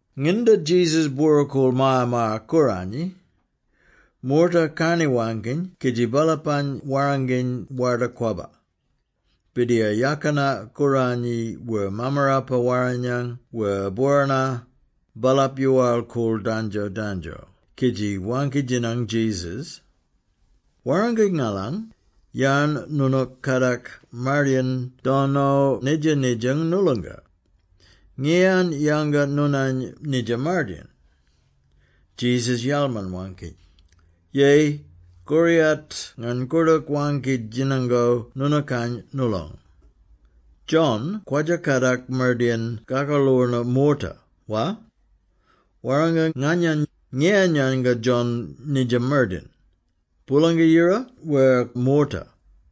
Nginda Jesus bwora-koorl Maya-maya-Kooranyi, moorta karni-waangkiny kidji baalapany warranginy Warda-Kwabba, Birdiyar Yakina Kooranyi wer Mammarapa-Warrinyang wer bworana, baalap yoowal-koorl dandjo-dandjo kidji waangki-djinang Jesus, “Warranga ngalany, yarn noonook kadak mardayin dono nidja-nidja noolonga? Ngiyan yanga noonany nidja mardayin?” Jesus yalman-waangki, “Yeyi, koriyat ngany koordook waangki-djinango noonookany noolong. John kwadja-kadak mardayin kakaloorno moorta, wa? Warranga nganyany, ngiyan yanga John nidja mardayin? Boolanga-Yira ka moorta?”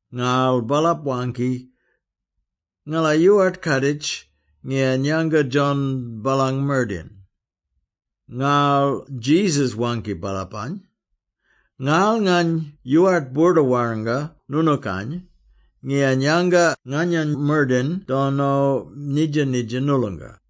Ngarl baalap waangki, “Ngala yoowart kaaditj ngiyan yanga John baalang mardayin.” Ngarl Jesus waangki baalapany, “Ngarl ngany yoowart boorda-warranga noonookany ngiyan yanga nganyany mardayin dono nidja-nidja noolonga.”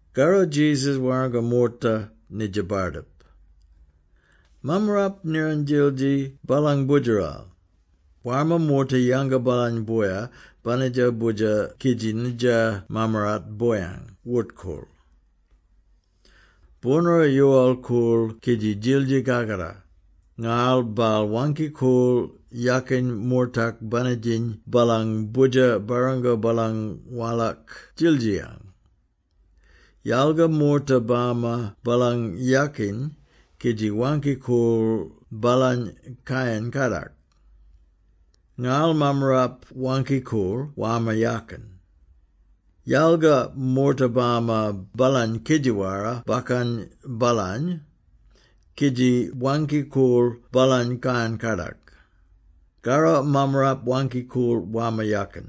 Karro Jesus warranga moorta nidja bardip. “Mammarap niran djildji baalang boodjeral. Warma moorta yanga baalany boya banitjo boodjer kidji nidja mammarap boyang wort-koorl. Boornoora yoowal-koorl kidji djildji kakatar, ngarl baal waangki-koorl yakin moortak banitjiny baalang boodjer barrango baalang walak djildjiyang. Yalga moorta bama baalang yakin kidji waangki-koorl baalany kayan-kadak. Ngarl mammarap waangki-koorl warma yakin; yalga moorta bama baalany kidji wara-bakkan baalany, kidji waangki-koorl baalany kayan-kadak. Karro mammarap waangki-koorl warma yakin;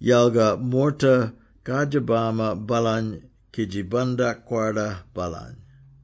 yalga moorta kardjir bama baalany kidji bandak-kwarda baalany.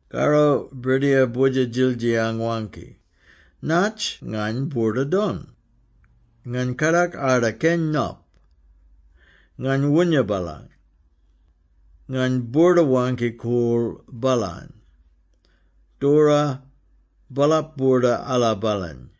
“Karro birdiyar boodjer-djildjiyang waangki, ‘Natj ngany boorda-don? Ngany kadak arda keny nop. Ngany woonya baalany. Ngany boorda-waangki-koorl baalany. Doora, baalap boorda ala baalany!’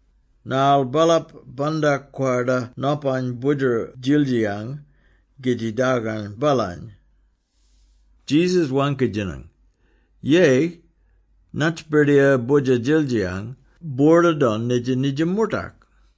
Ngarl baalap bandak-kwarda nopany boodjer-djildjiyang kidji dargang baalany.” Jesus waangki-djinang, “Yeyi, natj birdiyar boodjer-djildjiyang boorda-don nidja-nidja moortak?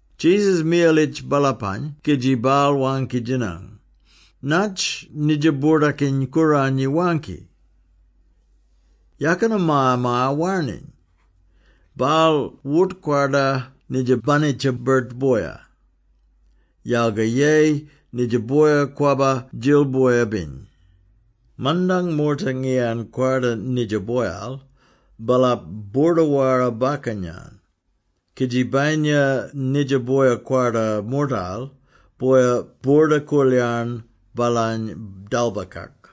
Jesus miyalitj baalapany kidji baal waangki-djinang, “Natj nidja Boordakiny-Kooranyi waangki? ‘Yakina maya-maya warniny, baal wort-kwarda nidja banitja-birt boya, yalga yeyi nidja boya kwabba-djil boya-biny.’ Mandang moorta ngiyan kwarda nidja boyal, baalap boorda-wara-bakkan-yan; kidji bayinya nidja boya kwarda moortal, boya boorda-koolyarn baalany dalbakak.”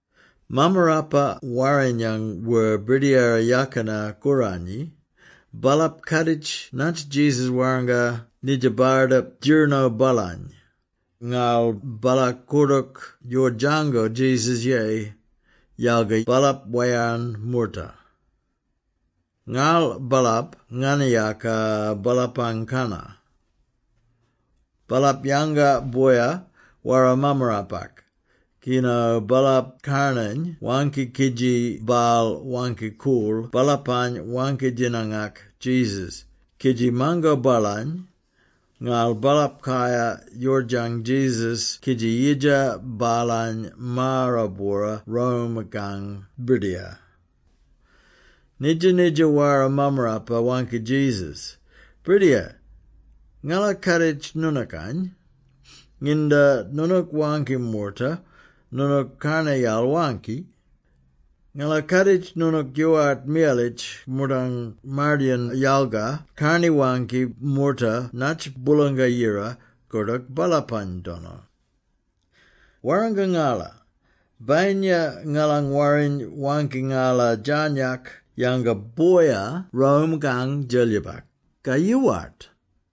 Mammarapa-Warrinyang wer Birdiyara Yakina-Kooranyi, baalap kaaditj natj Jesus warranga nidja bardip djirino baalany, ngarl baala koordook yoordjango Jesus yeyi, yalga baalap wayarn moorta. Ngarl baalap nganayaka baalapang kannar. Baalap yanga boya wara mammarapak kino baalap karnany waangki kidji baal waangki-koorl baalapany waangki-djinangak Jesus kidji mango baalany, ngarl baalap kayar yoordjang Jesus kidji yidja baalany maara-bwora Rome-kang Birdiyar. Nidja-nidja wara mammarapa waangki Jesus “Birdiyar, ngala kaaditj noonookany. Nginda noonook waangki moorta, noonook karnayal waangki. Ngala kaaditj noonook yoowart miyalitj moortang mardayin yalga karni-waangki moorta natj Boolanga-Yira koordook baalapany dono. Warranga ngala, bayinya ngalang warriny waangki ngala djarnyak yanga boya Rome-kang Djelyibak, ka yoowart?”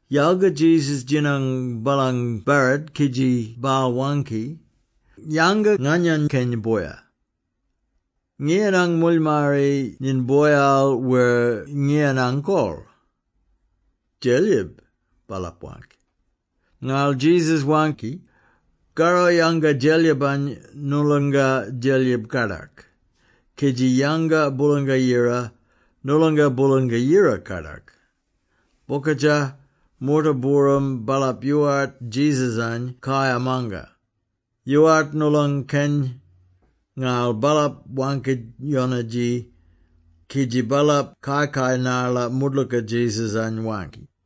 Yalga Jesus djinang baalang barrit kidji baal waangki, “Yanga nganyany keny boya. Ngiyanang moolyimarri nyiny boyal wer ngiyanang kol?” “Djelyib,” baalap waangki. Ngarl Jesus waangki, “Karro, yanga Djelyibany noolonga Djelyib kadak, kidji yanga Boolanga-Yira noolonga Boolanga-Yira kadak.” Bokadja, moorta-booram, baalap yoowart Jesus-any kayar manga, yoowart noolong keny, ngarl baalap waangki-yonadji, kidji baalap kai-kai narla moodlooka Jesus-any waangki.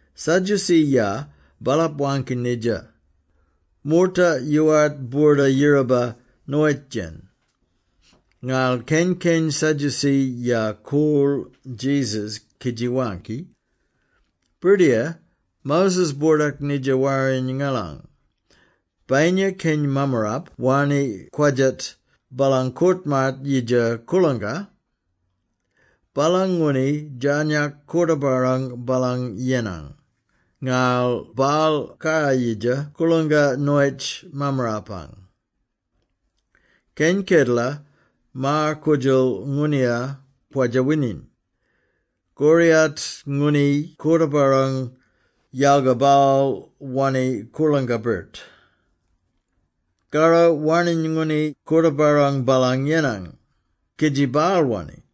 Sadducee-ya, baalap waangki nidja: moorta yoowart boorda-yiraba noyitj-yen, ngarl keny-keny Sadducee-ya koorl Jesus kidji waangki, “Birdiyar, Moses boordak nidja Warriny ngalang: ‘Bayinya keny mammarap wanni kwadjat baalang koort-maat yidja koorlangka, baalang ngooni djarnyak koorta-barrang baalang yenang, ngarl baal kayar-yidja koorlangka noyitj mammarapang.’ Keny kedela, maar-koodjal ngooniya kwadja-wining. Koriyat ngooni koorta-barrang, yalga baal wanni koorlangka-birt. Karro warning ngooni koorta-barrang baalang yenang, kidji baal wanni.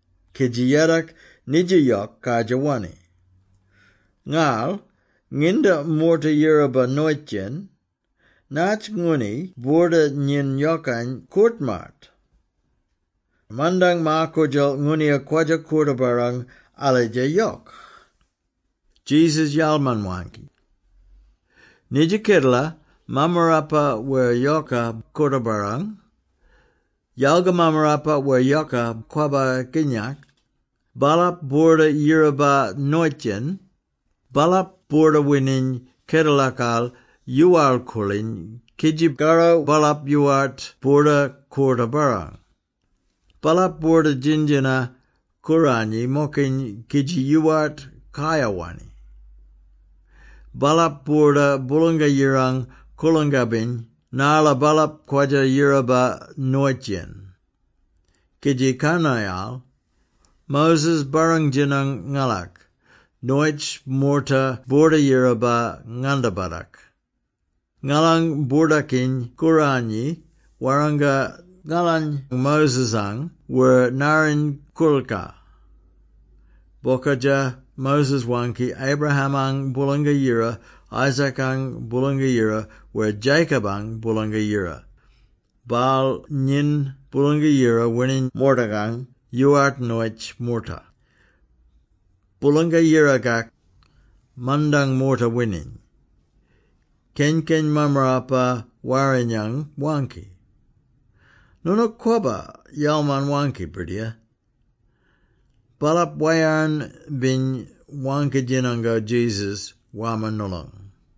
kidji yadok, nidja yok kardjir wanni. Ngarl, nginda moorta yiraba noyitj-yen, natj ngooni boorda nyiny yokang koort-maat? Mandang maar-koodjal ngooniya kwadja-koorta-barrang alidja yok.”, Jesus yalman-waangki, “Nidja kedela, mammarapa wer yoka koorta-barrang, yalga mammarapa wer yoka kwabba kinyak, baalap boorda yiraba noyitj-yen, baalap boorda-wining kedelakal yoowal-koorliny kidji karro baalap yoowart boorda-koorta-barrang. Baalap boorda djin-djina-kooranyi-mokiny kidji yoowart kayar-wanni. Baalap boorda Boolanga-Yirang koorlangka-biny narla baalap kwadja-yiraba noyitj-yen. Kidji karnayal, Moses barrang-djinang ngalak, noyitj moorta boorda-yiraba ngandabatak. Ngalang Boordakiny-Kooranyi warranga ngalany Moses-ang wer narriny koorilkar. Bokadja, Moses waangki, ‘Abraham-ang Boolanga-Yira, Isaac-ang Boolanga-Yira wer Jacob-ang Boolanga-Yira.’ Baal nyiny Boolanga-Yira wining moortakang, yoowart noyitj moorta. Boolanga-Yirakak, mandang moorta wining.” Keny-keny Mammarapa-Warrinyang waangki, “Noonook kwabba yalman-waangki, Birdiyar!” Baalap wayarn-biny waangki-djinango Jesus warma noolong.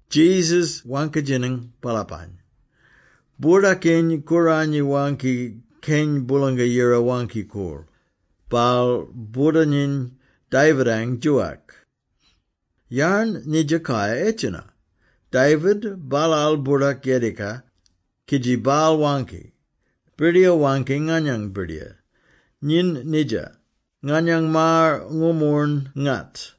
Jesus waangki-djinang baalapany, “Boordakiny-Kooranyi waangki ‘Keny Boolanga-Yira Waangki-Koorl,’ baal boorda-nyiny David-ang djoowak. Yarn nidja kayar edjena? David baalaal boordak Yedika, kidji baal waangki, ‘Birdiyar waangki nganyang Birdiyar, “Nyin nidja, nganyang maar ngoornmoorn-ngat,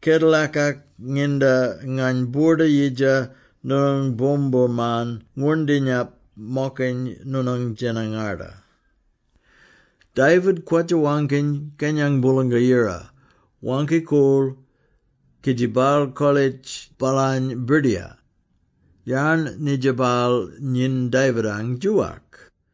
kedelakak nginda ngany boorda-yidja noonang boomboorman ngwoorndinyap-mokiny noonang djena-ngarda.” ’ David kwadja-waangkiny Kenyang Boolanga-Yira Waangki-Koorl, kidji baal kolitj baalany ‘Birdiyar’. Yarn nidja baal nyin Davidang djoowak?”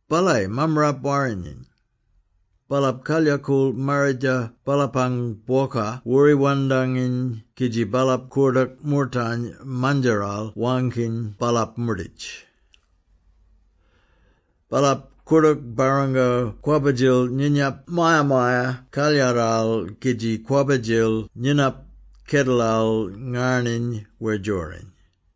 “Balayi Mammarapa-Warrinyang. Baalap kalyakool marridja baalapang bwoka woori wandanginy kidji baalap koordook moortany mandjaral waangkiny baalap moorditj. Baalap koordook barrango kwabba-djil nyinap Maya-maya-Kalyaral kidji kwabba-djil nyinap kedelal ngarniny wer djoriny.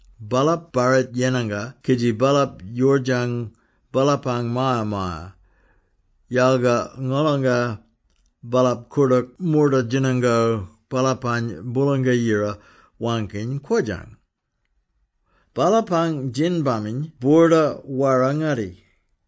Baalap barrit yenanga kidji baalap yoordjang baalapang maya-maya, yalga ngolonga, baalap koordook moorta djinango baalapany Boolanga-Yira waangkiny kwodjang! Baalapang djin-baminy boorda wara-ngatti!”